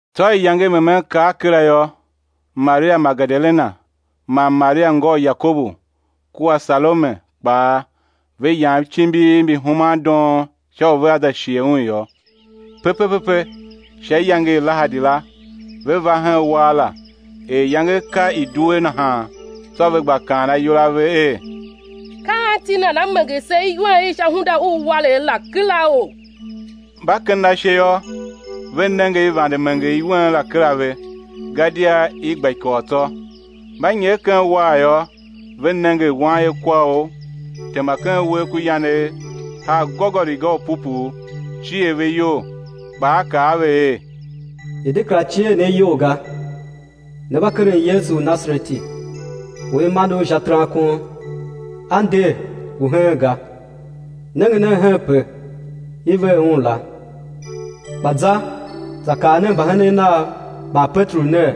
Tsô iyange i memen kar kera yô, Maria Magedalena man Maria ngô u Yakobu, kua Salome kpaa, ve yam icimbiv mbi human doon sha u vea za shighe Un yô. Pepe pepe sha iyange i Lahadi la, ve va hen uwar la, er iyange ka i due nahan. Tsô ve gba kaan ayol a ve er: Ka anti nana menger se iwen i sha hunda u uwaregh la keraou? Mba kenden ashe yô, ve nenge i vande menger iwen la kera ve, gadia i gba ikôl tsô. Mba nyer ken uwar la yô, ve nenge wanyekwaor tema ken uwegh ku yanegh, haa gôgôriga u pupuu; cier ve iyol. Kpa a kaa a ve er: I̱ de kera cier ne iyol ga; ne mba keren Yesu u Nasareti, u i mande Un sha terankon. A nder, ngu heen ga; nenge nen henpe i ver Un la. Kpa za, za kaa nen mbahenen Nav man Peteru ner: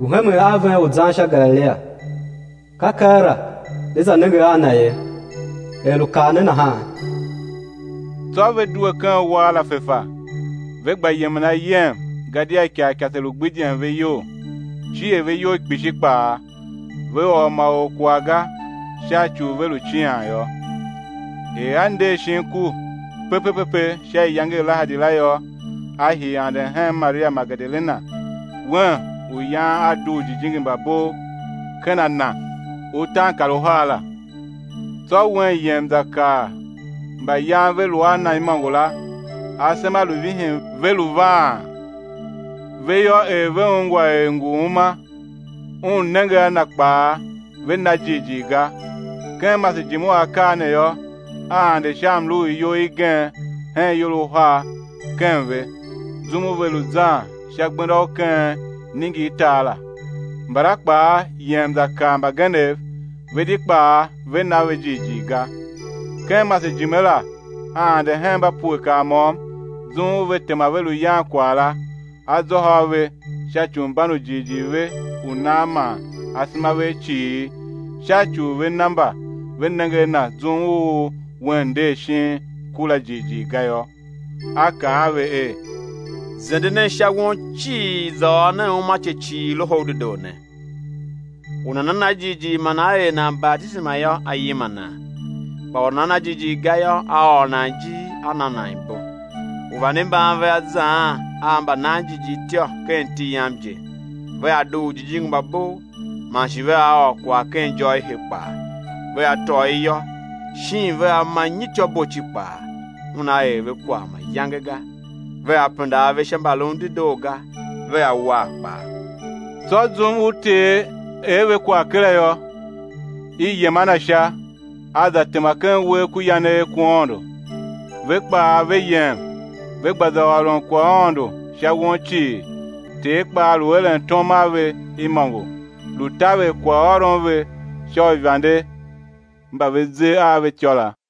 Ngu hemen a ven u zan sha Galilia, ka keela né za nenge a Na ye, er lu kaa ne nahan. Tsô ve due ken uwar la fefa, ve gba yemen ayem, gadia ikarikase lu gbidyen ve iyol, cier ve iyol kpishi kpaa, ve ôr ma or kwagh ga, sha ci u ve lu cian yô. Er a nder shin ku pepe pepe sha iyange i lahadi la yô, A hii anden hen Maria Magedalena, un u yan A dugh ujijingi mba bov ken a na utaankaruhar la. Tsô un yem za kaa mba yan ve lu a Na imôngo la; asema lu vihin ve, ve lu vaan. Ve yô, er ve ungwa er ngu uma, un nenge a Na kpaa, ve na jighjigh ga. Ken masejime u akaa ne yô, A ande sha mlu u iyol igen hen ior uhar ken ve, zum u ve lu zan sha gbenda u ken iningirtar la. Mbala kpaa yem, za kaa mbagenev; ve di kpaa ve na ve jighjigh ga. Ken masejime la, A ande hen mba pue kar môm zum u ve tema ve lu yan kwagh la, A zôhô a ve sha ci u mban u jighjigh ve u nan man asema ve a cighir, sha ci u ve ne mba ve nenge a Na zum u Un nder shin ku la jighjigh ga yô. A kaa a ve er: Zende nen sha won cii, za ôr nen uumace cii Loho u dedoo ne. U nana na jighjigh man á er nan batisema yô, á yima nan. Kpa u nana na jighjigh ga yô, á ôr nan ijir á na nan ibo. Uivande mban kpaa vea zaan a mbananjighjigh ityô; ken iti Yam je, vea dugh ujijingi mba bov, man shi vea ôr kwagh ken ijô i he kpaa; vea tôô iyô, shin vea ma nyityô boci kpaa, una er ve kwagh mayange ga; vea penda ave sha mbalun dedoo ga, vea war kpaa. Tsô zum u Ter er ve kwagh kera yô, i yem a Na Sha, A za tema ken uwegh ku yanegh ku Aôndo. Ve kpaa ve yem, ve gba za ôron kwaghaôndo sha won cii; Ter kpaa lu eren tom a ve imôngo, lu taver kwaghôron ve sha uivande mba ve ze a ve ityô la.